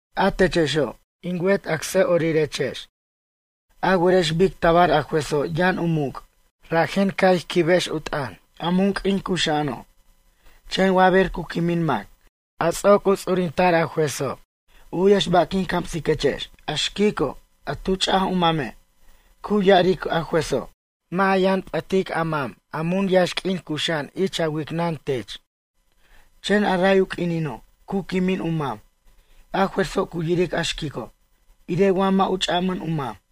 A techexo', in wet acsa'orirex, a werex bic tabar a juezo' yʌn u muc', rajen ca' ij quibex u t'ʌn, a mun q'uin cuxa'ano'. Chen wa ber cu quimin mac, a ts'oc u ts'urinta'r juezo'. U'yex ba' quin camsiquechex. A xquico', a tu ch'aj u mame', cu ya'aric a juezo': “Mʌ' ja yʌn p'ʌtic a mam a mun yaxq'uin cuxa'an ich a wicnʌn tech.” Chen a ray u q'uinino', cu quimin u mam, a juezo' cu yiric a xquico', irej wa mʌ' u ch'amʌn u mam.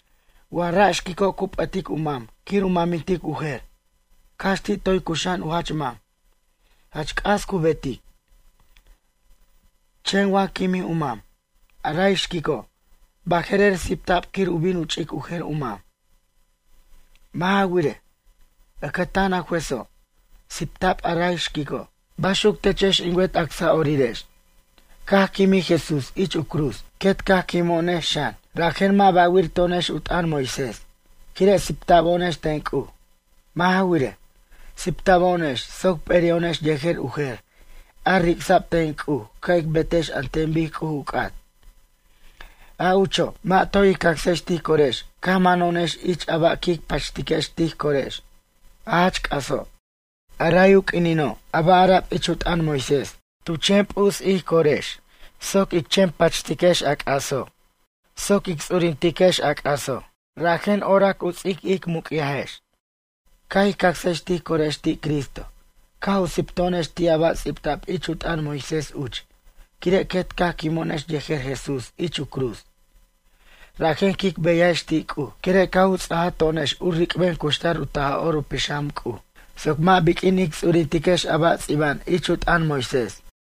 Wa ra' xquico' cu p'ʌtic u mam quir u mamintic u jer, cax ti' toy cux'a'an u jach mam. Jach c'as cu betic. Chen wa quimij u mam, a ray xquico', baje'rer sipta'b quir u bin u ch'ic u jer u mam. Mʌ' ja wirej, ʌcʌtan a juezo', sipta'b a ray xquico'. Baxuc techex in wet acsa'orirex, caj quimij Jesús ich u cruz, quet caj quimo'onex xan, rajen mʌ' ba'wir to'onex u t'ʌn Moisés, quire' sipta'bo'onex ten C'uj. Mʌ' ja wirej, sipta'bo'onex soc p'eri'o'onex yejer u jer, a ric'sa'b ten C'uj ca' ic betex an ten bic C'uj u c'at. A ucho', mʌ' toy ij cacsex tij corex caj mano'onex ich a ba' quic pachtiquex tij corex, a jach c'aso'. A ray u q'uinino' a ba' ara'b ich u t'ʌn Moisés tu chen p'us ij corex soc ic chen pachtiquex a c'aso', soc ic ts'urintiquex a c'aso', rajen oric u ts'ic muc'yajex. Caj ij cacsex tij corex ti' Cristo, caj u sipto'onex ti' a ba' ts'ibta'b ich u t'ʌn Moisés uch, quire' quet caj quimo'onex yejer Jesús ich u cruz. Rajen quic beyajex ti' C'uj, quire' caj u ts'ajaj to'onex u ric'ben cuxtar u Taj'or u Pixam C'uj, soc mʌ' biq'uin ic ts'urintiquex a ba' ts'iba'an ich u t'ʌn Moisés.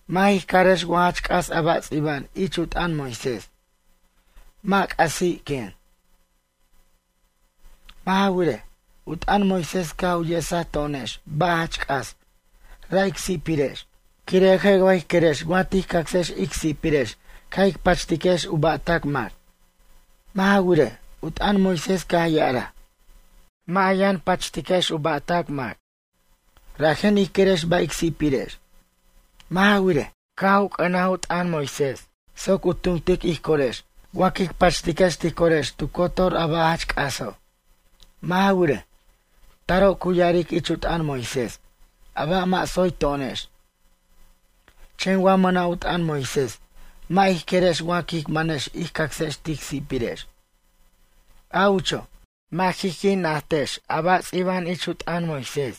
Mʌ' jij carex wa jach c'as a ba' ts'iba'an ich u t'ʌn Moisés. Mʌ' c'asi', quen. Mʌ' ja wirej, u t'ʌn Moisés caj u yesaj to'onex ba' jach c'as, ra' ic si'pirex. Quire' je' wa jij querex wa tij cacsex ic si'pirex caj ij pachtiquex u ba'tac mac? Mʌ' ja wirej, u t'ʌn Moisés caj ya'araj: “Mʌ' ja yʌn pachtex u ba'tac mac.” Rajen ij querex ba' ic si'pirex. Mʌ' ja wirej, caj u c'ʌnaj u t'ʌn Moisés soc u tumtic ij corex wa quic pachtiquex tij corex tu cotor a ba' jach c'aso'. Mʌ' ja wirej, taro' cu ya'aric ich u t'ʌn Moisés, a ba' mʌ' tsoy to'onex. Chen wa mʌna' u t'ʌn Moisés mʌ' ij querex wa quic manex ij cacsex tic si'pirex. A ucho', mʌ' jij qui' najtex a ba' ts'iba'an ich u t'ʌn Moisés.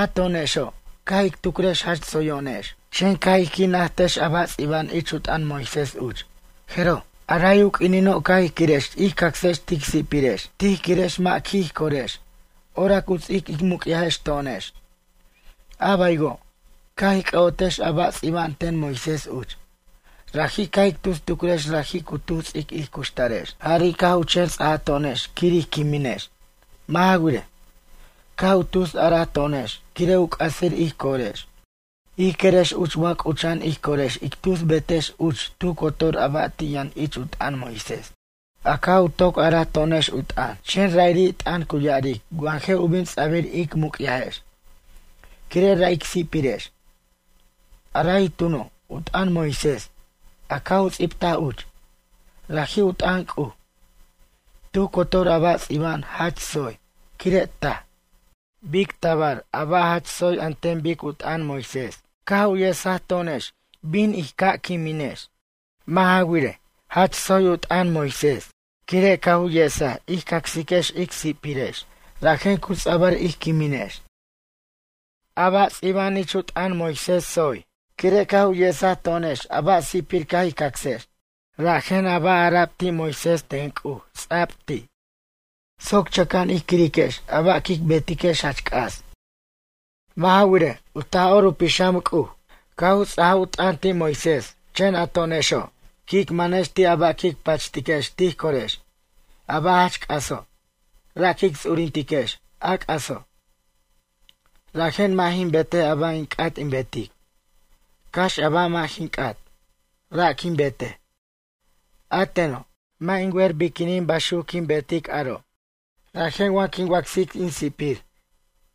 A to'onexo', caj ic tucrex jach tsoyo'onex. Chen caj ij qui' najtex a ba' ts'iba'an ich u t'ʌn Moisés uch, jeroj, a ray u q'uinino' caj ij quirex ij cacsex tic si'pirex. Tij quirex mʌ' qui' ij corex, orac u ts'ic ic muc'yajex to'onex. A baywo', caj ic c'ʌ'otex a ba' ts'iba'an ten Moisés uch, raji' caj ic tus tucrex raji' cu ts'ic ij cuxtarex, jari' caj u chen ts'ato'onex quir ij quiminex. Mʌ' ja wirej, caj u tus araj to'onex quire' u c'asir ij corex. Ij querex uch wa c'ucha'an ij corex ic tus betex uch tu cotor a ba' ti' yʌn ich u t'ʌn Moisés, a caj u toc a'ara to'onex u t'ʌn, chen ra'iri' t'ʌn cu ya'aric wa je' u bin ts'abir ic muc'yajex, quire' ra' ic si'pirex. A ray tuno', u t'ʌn Moisés, a caj u ts'ibtaj uch, raji' u t'ʌn C'uj. Tu cotor a ba' ts'iba'an jach tsoy, quire' taj. Bic tabar a ba' jach tsoy an ten bic u t'ʌn Moisés caj u yesaj to'onex bin in caj quiminex? Mʌ' ja wirej, jach tsoy u t'ʌn Moisés, quire' caj u yes ij cacsiquex ic si'pirex, rajen cu ts'abʌr ij quiminex. A ba' ts'iba'an ich u t'ʌn Moisés tsoy, quire' caj u yesaj to'onex a ba' sipir caj ij cacsex. Rajen a ba' ara'b ti' Moisés ten C'uj ts'a'b ti', soc chʌca'an ij quiriquex a ba' quic betiquex jach c'as. Mʌ' ja wirej, u Taj'or u Pixam C'uj, caj u ts'ajaj u t'ʌn ti' Moisés, chen a to'onexo', quic manex ti' a ba' quic pachtiquex tij corex, a ba' jach c'aso'. Ra' quic ts'urintiquex, a c'aso'. Rajen mʌ' jin betej a ba' in c'at in betic. Cax a ba' mʌ' jin c'at, ra' quin betej. A teno', mʌ' jin wer biquinin baxuc quin betic aro'. Rajen wa quin wacsic in si'pir,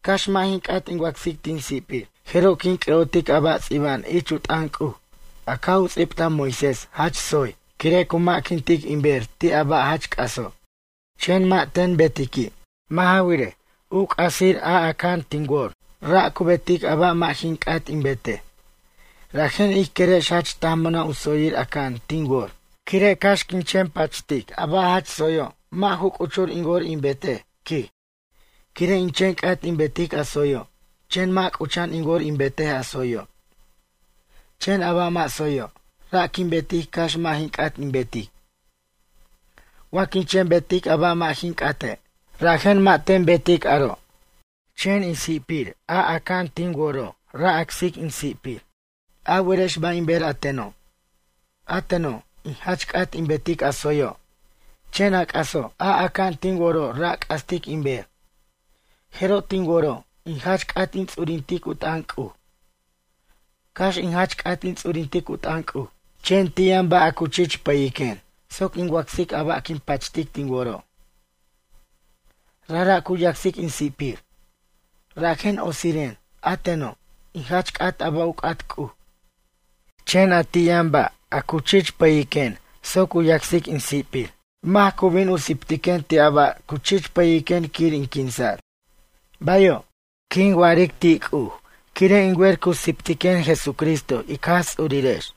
cax mʌ' jin c'at in wacsic tin si'pir, jeroj quin c'ʌ'otic a ba' ts'iba'an ich u t'ʌn C'uj, a caj u ts'ibtaj Moisés jach tsoy, quire' cu ma'quintic in ber ti' a ba' jach c'aso'. Chen mʌ' ten betiqui'. Mʌ' ja wirej, u c'asir a aca'an tin wor, ra' cu betic a ba' mʌ' jin c'at in betej. Rajen ij querex jach taj mʌna' u tsoyir aca'an tin wor, quire' cax in chen pacht a ba' jach tsoyo' mʌ' ju c'uchur in wor in betej, quij. Quire' in chen c'at in betic a tsoyo', chen mʌ' c'ucha'an in wor in betej a tsoyo'. Chen a ba' mʌ' tsoyo', ra' quin betic cax mʌ' jin c'at in betic. Wa quin chen betic a ba' mʌ' jin c'ate', rajen mʌ' ten betic aro', chen in si'pir a aca'an tin woro' ra' acsic in si'pir. A werex ba' in ber a teno'? A teno', in jach c'at in betic a tsoyo', chen a c'aso', a aca'an tin woro' ra' c'astic in ber. Jeroj tin woro', in jach c'at in ts'urintic u t'ʌn C'uj. Cax in jach c'at in ts'urintic u t'ʌn C'uj, chen ti' yʌn ba' a cu chich pʌyiquen, soc in wacsic a ba' quin pachtic tin woro', rajra' cu yacsic in si'pir. Rajen otsiren, a teno', in jach c'at a ba' u c'at C'uj, chen a ti' yʌn, ba' a cu chich pʌyiquen soc u yacsic in sipir. Mac cu bin u siptiquen ti' a ba' cu chich pʌyiquen quir in quinsa'r? “Bayo'”, quin wa'aric ti' C'uj, quire' in wer cu siptiquen Jesucristo ic Jaj Ts'urirex.